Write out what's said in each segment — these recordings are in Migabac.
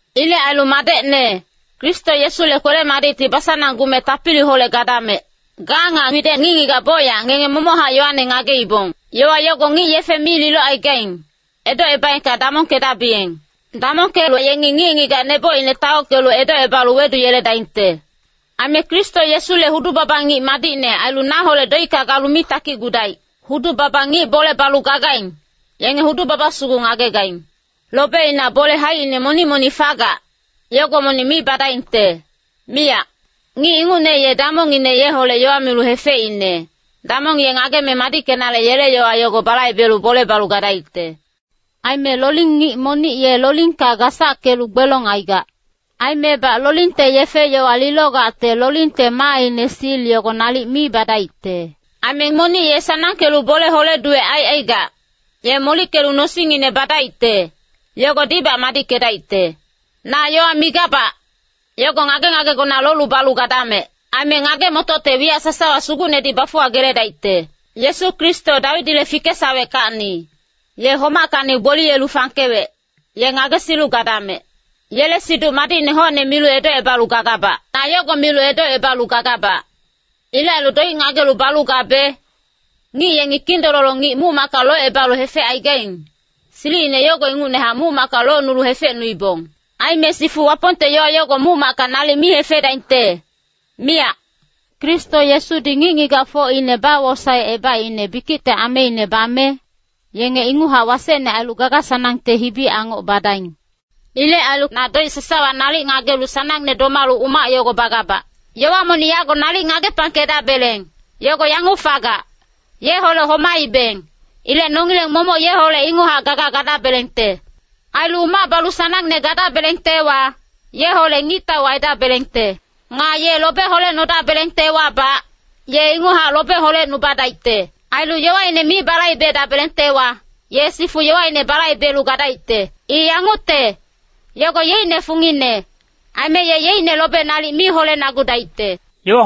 Ilec ailu madecne, Kristo Yesule kwele-madicti basananggume tapiliholec gadamec. Ga nga widec ngic-ngigac bocyac ngenge momochac yowane ngageibong. Yowa yogo ngic yefe mi lilocaigaing, edocebaengka damongkedabiyeng. Damongkelu yengi ngic-ngigac nebocine taockelu edocebalu weduyeledaingte. Aime Kristo Yesule hudu-baba ngic madicne ailu naholec doicka galu mi takicgudaic. Hudu-baba ngic bole balu gagaing, yenge hudu-baba sugu ngagegaing. Lobeina bole haicine monic-monic fagac, yogo monic mi badaingte, miyac. Ngic ingucne ye damongngine yeholec yowa milu hefeicne, damong ye ngageme madickenale yele yowa yogo balaibelu bole balu gadaicte. Aime loling ngic monic ye lolingka gasackelu gbelong aigac. Aimebac lolingte yefe-yowa lilogacte lolingte maaine sil yogo nalic mi badaicte. Aime monic ye sanangkelu bole hole-duwec aicaigac, ye molickelu nosingngine badaicte, yogodibac madickedaicte. Na yowa migabac, yogo ngage-ngagegona lolu balu gadamec. Aime ngage-motocte wiyac sasawa Sugucnedi bafuwageledaicte. Yesu Kristo, Dawidile fikesaweckacni, ye homackacni gboliyelu fangkewec, ye ngagesilu gadamec. Yele Siduc Madicne hocne milu edocebalu gagabac. Na yogo milu edocebalu gagabac. Ilec ailu doic ngagelu balu gabe, ngic yengi kindololo ngic muc-macka locebalu hefecaigaing, silicine yogo ingucnehac muc-macka locnulu hefecnuibong. Aime sifu Wapongte yowa yogo muc-macka nalic mi hefedaingte, miyac. Kristo Yesudi ngic-ngigacfocine bawosaecebaicne bikicte ameine bame, yenge inguchac wasecne ailu gaga-sanangte hibi-angoc badaing. Ilec ailu na doic sasawa nalic ngagelu sanangne domalu umac yogo bagabac. Yowa monic yago nalic ngagepangkedabeleng, yogo yanguc fagac, Yeholec homaibeng. Ilec nongileng momoc yeholec inguchac gaga gadabelengte. Ailu umac balu sanangne gadabelengtewa, yeholec ngictau aidabelengte. Nga ye lobe holecnodabelengtewabac, ye inguchac lobe holecnubadaicte. Ailu yowaine mi balaibedabelengtewa, ye sifu yowaine balaibelu gadaicte. I yangucte, yogo yeicne fungine, aime ye yeicne lobe nalic mi holenagudaicte.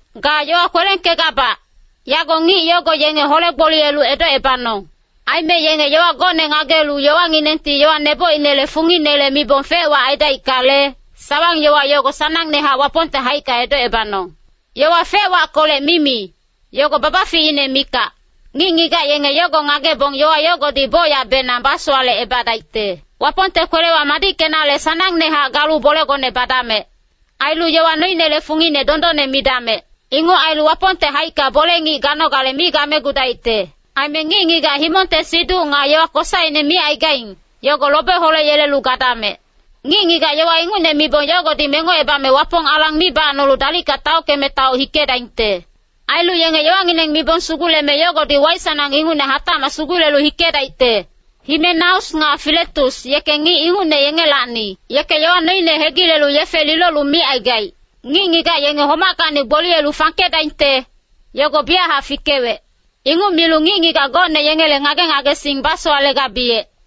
Ga yowa kwelengkegabac, yago ngic yogo yenge hole-gboliyelu edocebanong. Aime yenge yowa gocne ngagelu yowanginengti yowa nebocinele funginele mibong fec-wac aidaickale, sawang-yowa yogo sanangnehac Wapongte haicka edocebanong. Yowa fec-wackolec mimi, yogo babaficine mikac. Ngic-ngigac yenge yogo ngagebong yowa yogodi bocyacbenang basowalecebadaicte. Wapongte kwelewa madickenale sanangnehac galu bolegone badamec. Ailu yowa noinele fungine dondonne midamec. Inguc ailu Wapongte haicka bole-ngic ganogale mi gamegudaicte. Aime ngic-ngigac himongte siduc nga yowa kosaine micaigaing, yogo lobe holeyelelu gadamec. Ngic-ngigac yowa ingucne mibong yogodi mengocebame Wapong alang mi bacnolu dalicka taockeme taoc hikedaingte. Ailu yenge yowangineng mibong suguleme yogodi waic sanangne ingucne hatacmac sugulelu hikedaicte. Himenaus nga Filetus yeke ngic ingucne yengelacni. Yeke yowa noine hegilelu yefe lilolu micaigaic, “Ngic-ngigac yenge homackacni gboliyelu fangkedaingte, yogo biyachac fikewec.” Inguc milu ngic-ngigac gocne yengele ngage-ngagesing basowalegabiyec.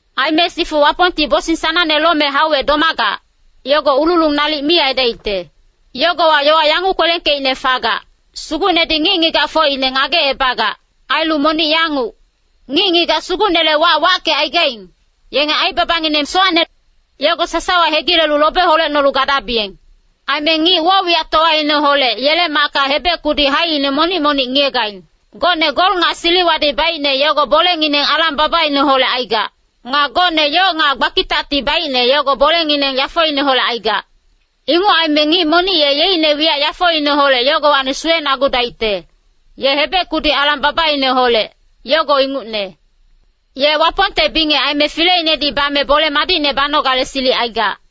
Aime sifu Wapongti bosing sanangne lome hauwec domagac, yogo ululung nalic mi aidaicte. Yogowa yowa yanguc kwelengkeicne fagac, “Sugucnedi ngic-ngigacfocine ngagecebagac.” Ailu monic yanguc, “Ngic-ngigac Sugucnele wac wackecaigaing, yenge aibabangineng sowacne, yogo sasawa hegilelu lobe holecnolu gadabiyeng.” Aime ngic woc-wiyactowaineholec yele macka hebec-kudi haicine monic-monic ngiyegaing. Gocne gol nga siliwadi baicne yogo bolengineng alang-babaineholec aigac. Nga gocne yoc nga gbakitacti baicne yogo bolengineng yafoineholec aigac. Inguc aime ngic monic ye yeicne wiyac yafoineholec yogowacni suwenagudaicte, ye hebec-kudi alang-babaineholec, yogo ingucne. Ye Wapongte bingec aime Fileinedi bame bole madicne banogale silic aigac.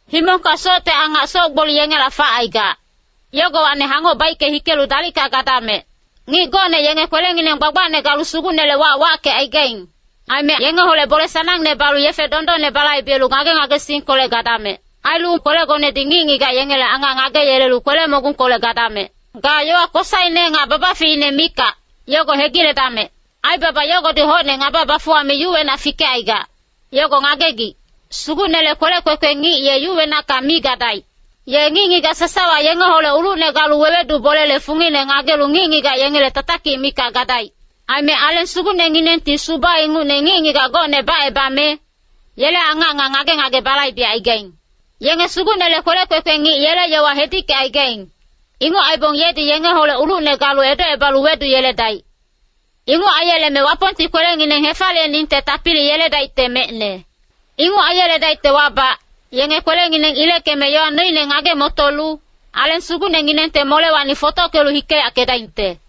Himongka socte angac soc-gboli yengela facaigac, yogowacni hangoc baicke hikelu dalicka gadamec. Ngic gocne yenge kwelengineng gbagbacne galu Sugucnele wac wackecaigaing. Aime yengeholec bole sanangne balu yefe dondonne balaibelu ngage-ngagesingkolec gadamec. Ailu kwelegonedi ngic-ngigac yengele angac ngageyelelu kwele-mogungkolec gadamec. Ga yowa kosaine nga babaficine mikac, yogo hegiledamec. Aibaba yogodi hocne ngaba bafuwame yuwenac fikecaigac, yogo ngagegic. Sugucnele kwelec kwekwe ngic ye yuwenacka mi gadaic. Ye ngic-ngigac sasawa yengeholec ulucne galu wewedu bolele fungine ngagelu ngic-ngigac yengele tatakic mikac gadaic. Aime Aleng Sugucnenginengti suba ingucne ngic-ngigac gocne bacebame, yele angac nga ngage-ngage balaibecaigaing. Yenge Sugucnele kwelec kwekwe ngic yele yowa hedickecaigaing, inguc aibong yedi yengeholec ulucne galu edocebalu weduyeledaic. Inguc aiyeleme Wapongti kwelengineng hefaliyeningte tapili yeledaicte mecne. Inguc aiyeledaictewabac, yenge kwelengineng ileckeme yowa noine ngage-motolu, Aleng Sugucnenginengte molewacni fotockelu hikeyackedaingte.